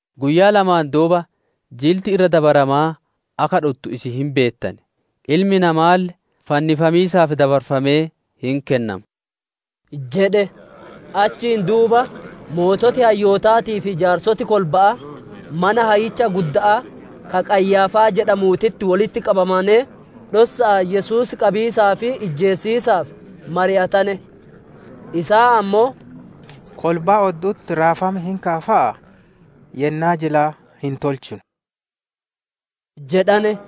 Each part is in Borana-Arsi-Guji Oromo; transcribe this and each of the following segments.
«Guyyaa lamaan duuba Jilti Irra Dabaramaa akka dhuttu isin hin beettan, Ilmi Namaalle fannifamiisaaf dabarfamee hin kennama» jedhe. Achiin duuba sooreyyiin hayyootaatii fi jaarsoti kolba'aa mana hayyicha gudda'aa ka Qayyaaffaa jedhamuutitti wolitti qabamanee, dhossa'aan Yesuus qabiisaa fi ijjeesisiisaaf mari'atane. Isaan ammoo, «Kolbaa oddu'utti raafam hin ka'a fa'aa, yennaa jilaa hin tolchinu» jedhane.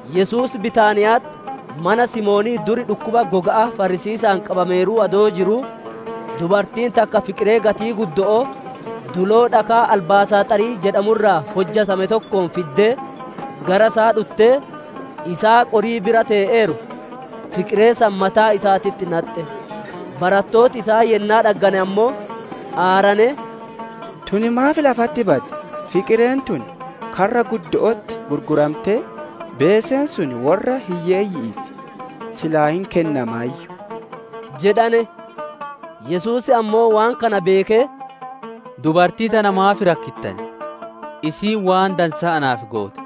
Yesuus Bitaaniya'atti mana Simoonii dur dhukkuba goga'aa farrisiisa'aan qabameeruu adoo jiruu, dubartiin takka fiqiree gatii guddo'oo, duloo dhakaa albaasaaxarii jedhamu irraa hojjatame tokkoon fiddee gara isaa dhuttee, isaa qorii bira tee'eeru, fiqiree san mataa isaatitti naxxe. Barattooti isaa yennaa dhaggane ammoo, aaranee, «Tun maaf lafatti baddi? Fiqireen tun karra guddo'otti gurgurantee, beeseen sun worra hiyyeeyyi'iif silaa hin kennamaayyu» jedhane. Yesuus ammoo waan kana beekee, «Dubartii tana maaf rakkittan? Isiin waan dansaa naaf goote.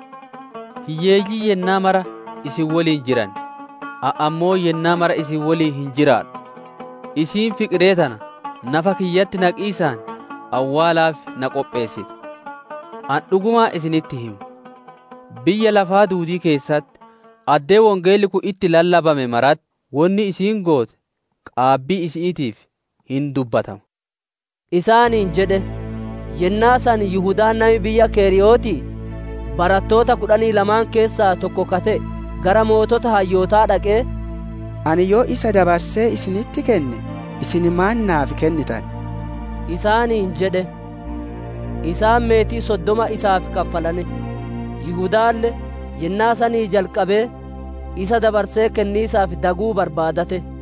Hiyyeeyyiin yennaa mara isin woliin jiran, ani ammoo yennaa mara isin woliin hin jiraadhu. Isiin fiqiree tana nafa kiyyatti naqiisaan awwaalaaf na qopheessite. Ani dhugumaan isinitti hima, biyya lafaa duudii keessatti, addee wongeelli kun itti lallabame maratti, wonni isiin goote qaabbii isi'iitiif hin dubbatama» isaaniin jedhe. Yennaa san Yihudaan nami biyya keriyootii, barattoota kudhanii lamaan keessaa tokko ka te'e, gara sooreyyii hayyootaa dhaqee, «Ani yoo isa dabarsee isinitti kenne, isin maan naaf kennitan?» isaaniin jedhe; isaan meetii soddoma isaaf kaffalane. Yihudaalle yennaa sanii jalqabee isa dabarsee kenniisaaf daguu barbaadate.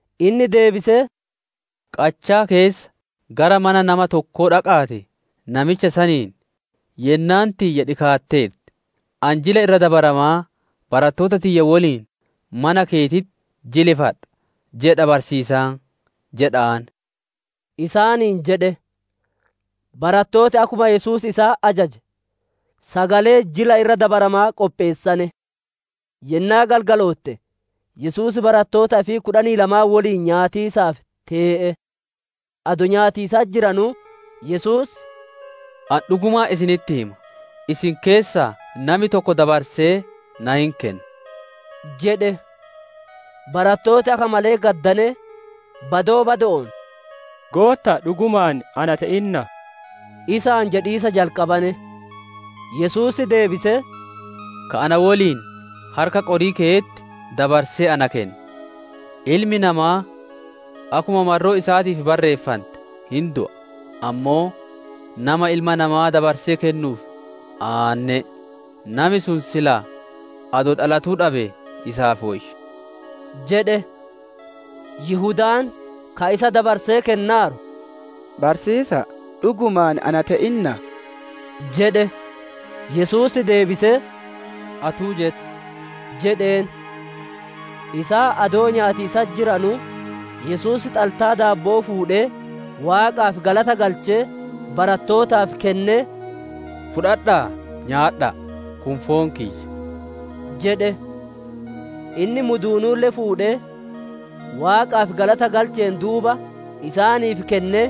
Inni deebisee, «Qachaa keessa gara mana nama tokkoo dhaqa'aatii, namicha saniin, ‹Yennaan tiyya dhikaatteerti; ani Jila Irra Dabaramaa barattoota tiyya woliin mana keetitti jilifadha, jedha barsiisaan› jedha'aan» isaaniin jedhe. Barattooti akkuma Yesuus isaan ajaje, sagalee Jila Irra Dabaramaa qopheessane. Yennaa galgalootte, Yesuus barattoota ifii kudhanii lamaan woliin nyaatiisaaf tee'e. Adoo nyaatiisatti jiranuu, Yesuus, «Ani dhugumaan isinitti hima, isin keessaa nami tokko dabarsee na hin keenna» jedhe. Barattooti akka malee gaddanee, badoo bado'oon, «Gootta'a, dhugumaan ana te'innaa?» isaan jedhiisa jalqabane. Yesuus deebisee, «Ka na woliin harka qorii keyetti dabarsee na kenna. Ilmi Namaa akkuma marroo isaatiif barreeffante hin du'a, ammoo nama Ilma Namaa dabarsee kennuuf aanne'e! Nami sun silaa adoo dhalatuu dhabee isaaf woyya» jedhe. Yihudaan, ka isa dabarsee kennaaru, «Barsiisa'a, dhugumaan ana te'innaa?» jedhe. Yesuus deebisee, «Atuu jette» jedheen. Isaan adoo nyaatiisatti jiranuu, Yesuus xaltaa daabbo'oo fuudhee, Waaqaaf galata galchee, barattootaaf kennee, «Fudhadha'aa, nyaadha'a; kun foon kiyya» jedhe. Inni muduunuulle fuudhee, Waaqaaf galata galcheen duuba, isaaniif kennee,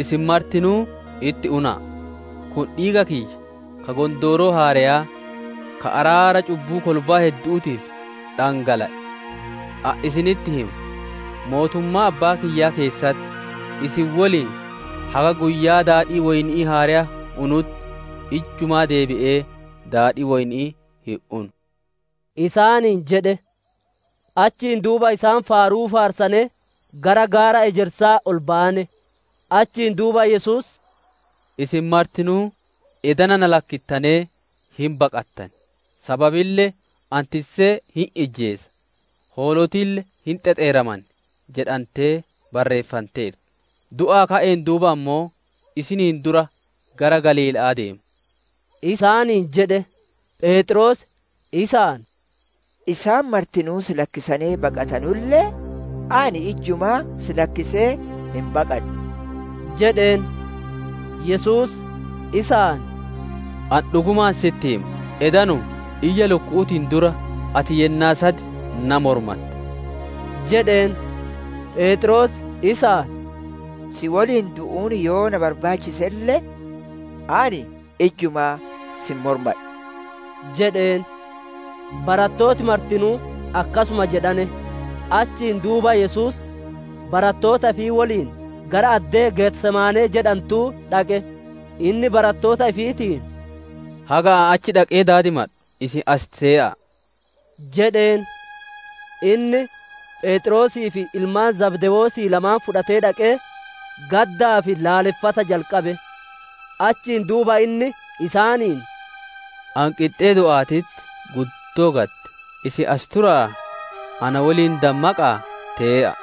«Isin martinuu, itti una'a; kun dhiiga kiyya, ka Gondooroo haareyaa, ka araara cubbuu kolbaa heddu'uutiif dhangala'e. Ani isinitti hima, mootummaa Abbaa kiyyaa keessatti isin woliin haga guyyaa daadhii woyni'ii haareya unutti, ijjumaa deebi'ee daadhii woyni'ii hin unu» isaaniin jedhe. Achiin duuba isaan faaruu faarsanee, gara gaara ejersaa ol bayane. Achiin duuba Yesuus, «Isin martinuu edana na lakkittanee hin baqattan; sababille, «‹Ani tissee hin ijjeesa, hoolotille hin xexeeraman› jedhantee barreeffanteerti. Du'aa ka'een duuba ammoo, isiniin dura gara Galiila'aa deema» isaaniin jedhe. Pheexroos, isaan, «Isaan martinuu si lakkisanee baqatanulle, ani ijjumaa si lakkisee hin baqadhu» jedheen. Yesuus, isaan, «Ani dhugumaan sitti hima, edanuma, iyya lukku'uutiin dura, ati yennaa sad na mormatta» jedheen. Pheexroos, isaan, «Si woliin du'uun yoo na barbaachiselle, ani ijjumaa si hin mormadhu» jedheen. Barattooti martinuu akkasuma jedhane. Achiin duuba Yesuus barattoota ifii woliin gara addee Getesemaanee jedhantuu dhaqe; inni barattoota ifiitiin, «Haga ani achi dhaqee daadimadhu, isin as tee'a'a!» jedheen. Inni Pheexroosii fi ilmaan Zabdewoosii lamaan fudhatee dhaqee, gaddaa fi laaleffata jalqabe. Achiin duuba inni, isaaniin, «Ani qixxee du'aatitti, guddoo gadde; isin as tura'aa, na woliin dammaqa'aa tee'a'a!»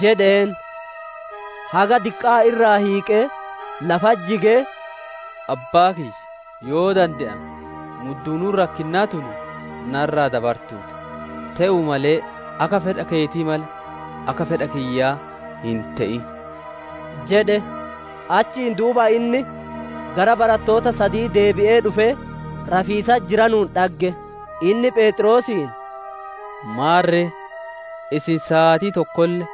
jedheen. Haga diqqaa irraa hiiqee, lafatti jigee, «Abbaa kiyya, yoo dande'ame, muduunuun rakkinnaa tun narra dabartuuti; te'uu male akka fedha keetii malee, akka fedha kiyyaa hin te'in» jedhe. Achiin duuba inni gara barattoota sadii deebi'ee dhufee, rafiisatti jiranuun dhagge; inni Pheexroosiin, «Maarre, isin saatii tokkolle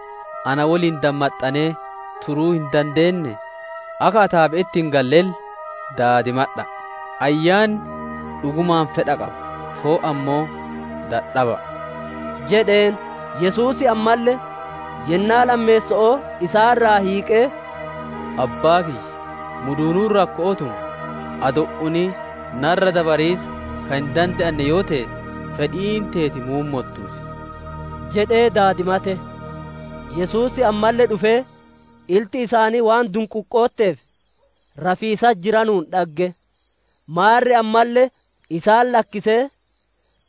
na woliin dammaxxanee turuu hin dandeennee? Akka ataabe'etti hin gallelle daadimadha'a; ayyaanni dhugumaan fedha qaba, foon ammoo dadhaba'a» jedheen. Yesuus ammalle yennaa lammeesso'oo isaan irraa hiiqee, «Abbaa kiyya, muduunuun rakko'oo tun adoo hin unin narra dabariisa ka hin dande'anne yoo teete, fedhiin teeti muummottuu ti» jedhee daadimate. Yesuus ammalle dhufee ilti isaanii waan dunquuqotteef, rafiisatti jiranuun dhagge. Maarre ammalle isaan lakkisee,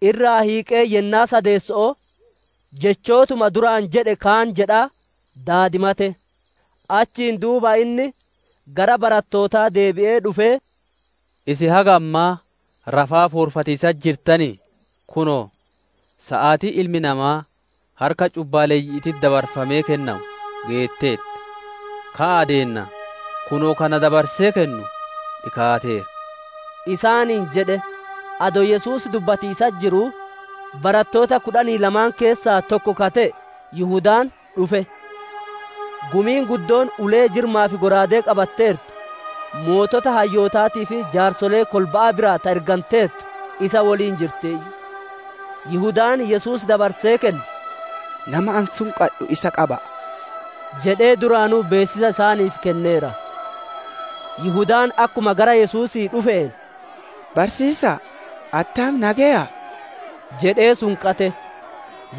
irraa hiiqee yennaa sadeesso'oo, jechootuma duraan jedhe kaan jedhaa daadimate. Achiin duuba inni gara barattootaa deebi'ee dhufee, «Isin haga ammaa rafaa, foorfatiisatti jirtanii? Kunoo, saatiin Ilmi Namaa harka cubbaaleyyi'iititti dabarfamee kennamu geetteerti. Ka'aa deennaa! Kunoo, ka dabarsee na kennu dhikaateera» isaaniin jedhe. Adoo Yesuus dubbatiisatti jiruu, barattoota kudhanii lama keessaa tokko ka te'e Yihudaan dhufe; gumiin guddoon ulee-jirmaa fi shallaagaa qabatteertu, sooreyyii hayyootaatii fi jaarsolee kolba'aa biraa ta erganteertu isa woliin jirtiiyyu. Yihudaan Yesuus dabarsee kennu, «Nama ani sunqadhu, isa qaba'a» jedhee duraanuu beessisa isaaniif kenneera. Yihudaan akkuma gara Yesuusii dhufeen, «Barsiisa'a, attam nageyaa!» jedhee sunqate.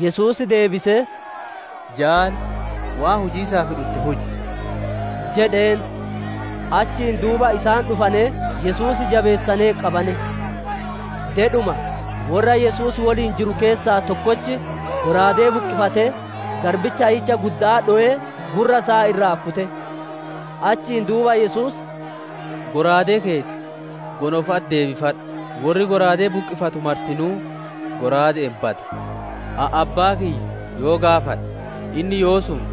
Yesuus deebisee, «Jaali, waan hujiisaaf dhutte huji» jedheen. Achiin duuba isaan dhufanee Yesuus jabeessanee qabane. Dedhuma, worra Yesuus woliin jiru keessaa tokkochi shallaagaa buqqifatee, garbicha hayyicha gudda'aa dhowee, gurra isaa irraa kute. Achiin duuba Yesuus, «Shallaagaa keeti gonofa'atti deebifadhu; worri shallaagaa buqqifatu martinuu shallaaga'aan bada. Ani Abbaa kiyya yoo gaafadhe, Inni yoosuma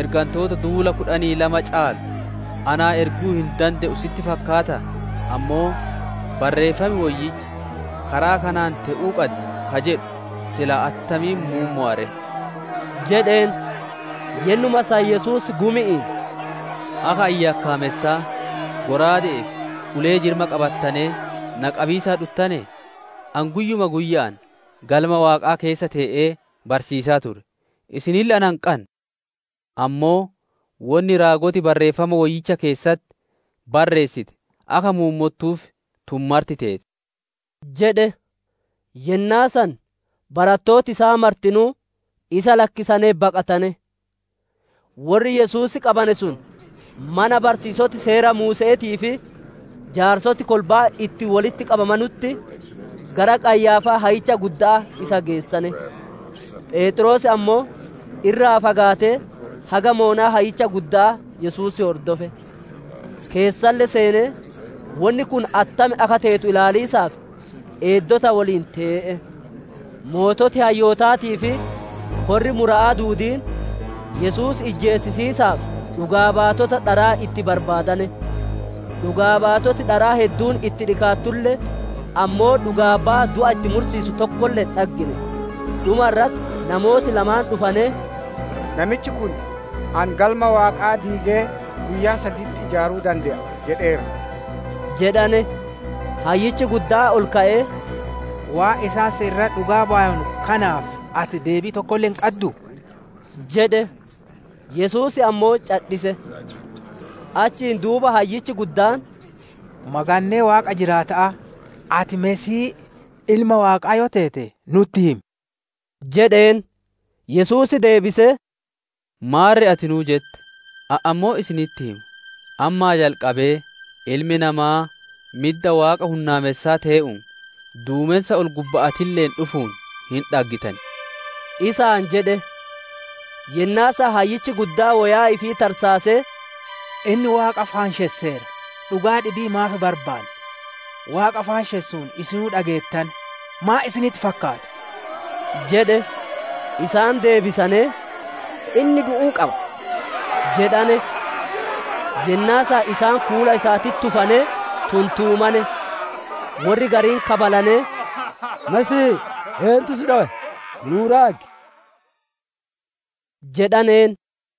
ergantoota duula kudhanii lama caalu naa erguu hin dande'u sitti fakkaataa? Ammoo Barreeffam Woyyichi karaa kanaan te'uu qaddi ka jedhu, silaa attamiin muummowa ree?» jedheen. Yennuma san Yesuus gumi'iin, «Akka ani yakkaamessaa, shallaaga'aa fi ulee-jirma qabattanee na qabiisaaf dhuttanee? Ani guyyuma guyya'aan Galma Waaqaa keessa tee'ee barsiisaa ture, isinille na hin qanne. Ammoo wonni raagoti Barreeffama Woyyicha keessatti barreessite akka muummottuuf, tun marti teete» jedhe. Yennaa san barattooti isaa martinuu isa lakkisanee baqatane. Worri Yesuus qabane sun, mana barsiisoti Seera Muuse'eetii fi jaarsoti kolba'aa itti wolitti qabamaneeranutti, gara Qayyaaffaa hayyicha gudda'aa isa geessane. Pheexroos ammoo irraa fagaatee haga badhinna dalleya hayyicha gudda'aa Yesuus hordofe; keessalle seenee, wonni kun attam akka teetu ilaaliisaaf, eeddota woliin tee'e. Sooreyyiin hayyootaatii fi korri mura'aa duudiin Yesuus ijjeesisiisaaf dhugaa baatota dharaa itti barbaadane. Dhugaa baatoti dharaa hedduun itti dhikaattulle, ammoo dhugaa baya du'a itti mursiisu tokkolle hin dhaggine; dhuma irratti namooti lamaan dhufanee, «Namichi kun, ‹Ani Galma Waaqaa diigee guyyaa saditti ijaaruu dande'a› jedheera» jedhane. Hayyichi guddaan ol ka'ee, «Waan isaan si irratti dhugaa bayanu kanaaf ati deebii tokkolle hin qadduu?» jedhe. Yesuus ammoo cadhise. Achiin duuba hayyichi guddaan, «Magannee Waaqa jiraata'aa, ati Masiihii, Ilma Waaqaa yoo teete nutti himi» jedheen. Yesuus deebisee, «Maarre atinuu jette. Ani ammoo isinitti hima, ammaa jalqabee Ilmi Namaa midda Waaqa hunnaamessaa tee'uun, duumensa ol-gubba'aatilleen dhufuun hin dhaggitan» isaan jedhe. Yennaa san hayyichi guddaan woyaa ifii tarsaasee, «Inni Waaqa faanshesseera! Dhugaa dhibii maaf barbaanna? Waaqa faanshessuun isinuu dhageettane. Maan isinitti fakkaata?» jedhe. Isaan deebisanee, «Inni du'uu qaba» jedhane. Yennaa san isaan fuula isaatitti tufanee tuntumane; worri gariin kabalanee, «Masiihii! Eentu si dhowe? Nuu raagi» jedhaneen.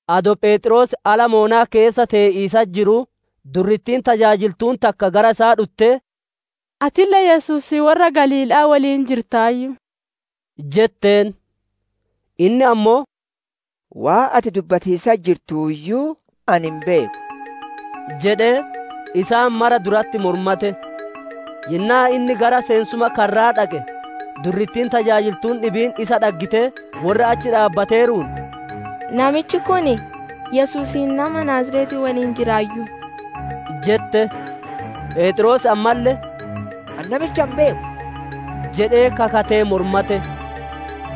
Adoo Pheexroos ala badhinna dalleyaa keessa tee'iisatti jiruu, durrittiin tajaajiltuun takka gara isaa dhuttee, «Atille Yesuusii worra Galiila'aa woliin jirtaayyu!» jetteen. Inni ammoo, «Waan ati dubbatiisatti jirtuuyyuu ani hin beeku» jedhee isaan mara duratti mormate. Yennaa inni gara seensuma karraa dhaqe, durrittiin tajaajiltuun dhibiin isa dhaggitee, worra achi dhaabbateeruun, «Namichi kun Yesuusii nama Naaziretii woliin jiraayyu» jette. Pheexroos ammalle, «Ani namicha hin beeku» jedhee kakatee mormate.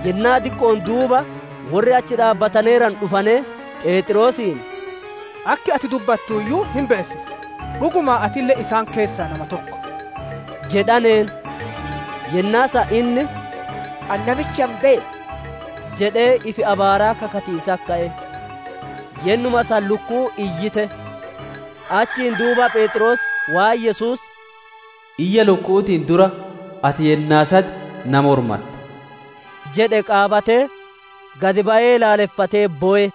Yennaa diqqo'oon duuba worri achi dhaabbataneeranu dhufanee, Pheexroosiin, «Akki ati dubbattuuyyuu hin beessisa, dhugumaan atille isaan keessaa nama tokko» jedhaneen. Yennaa san inni, «Ani namicha hin beeku» jedhee ifi abaaraa kakatiisatti ka'e. Yennuma san lukkuun iyyite. Achiin duuba Pheexroos waan Yesuus, «Iyya lukku'uutiin dura, ati yennaa sad na mormatta» jedhe qaabatee, gad bayee laaleffatee bowe.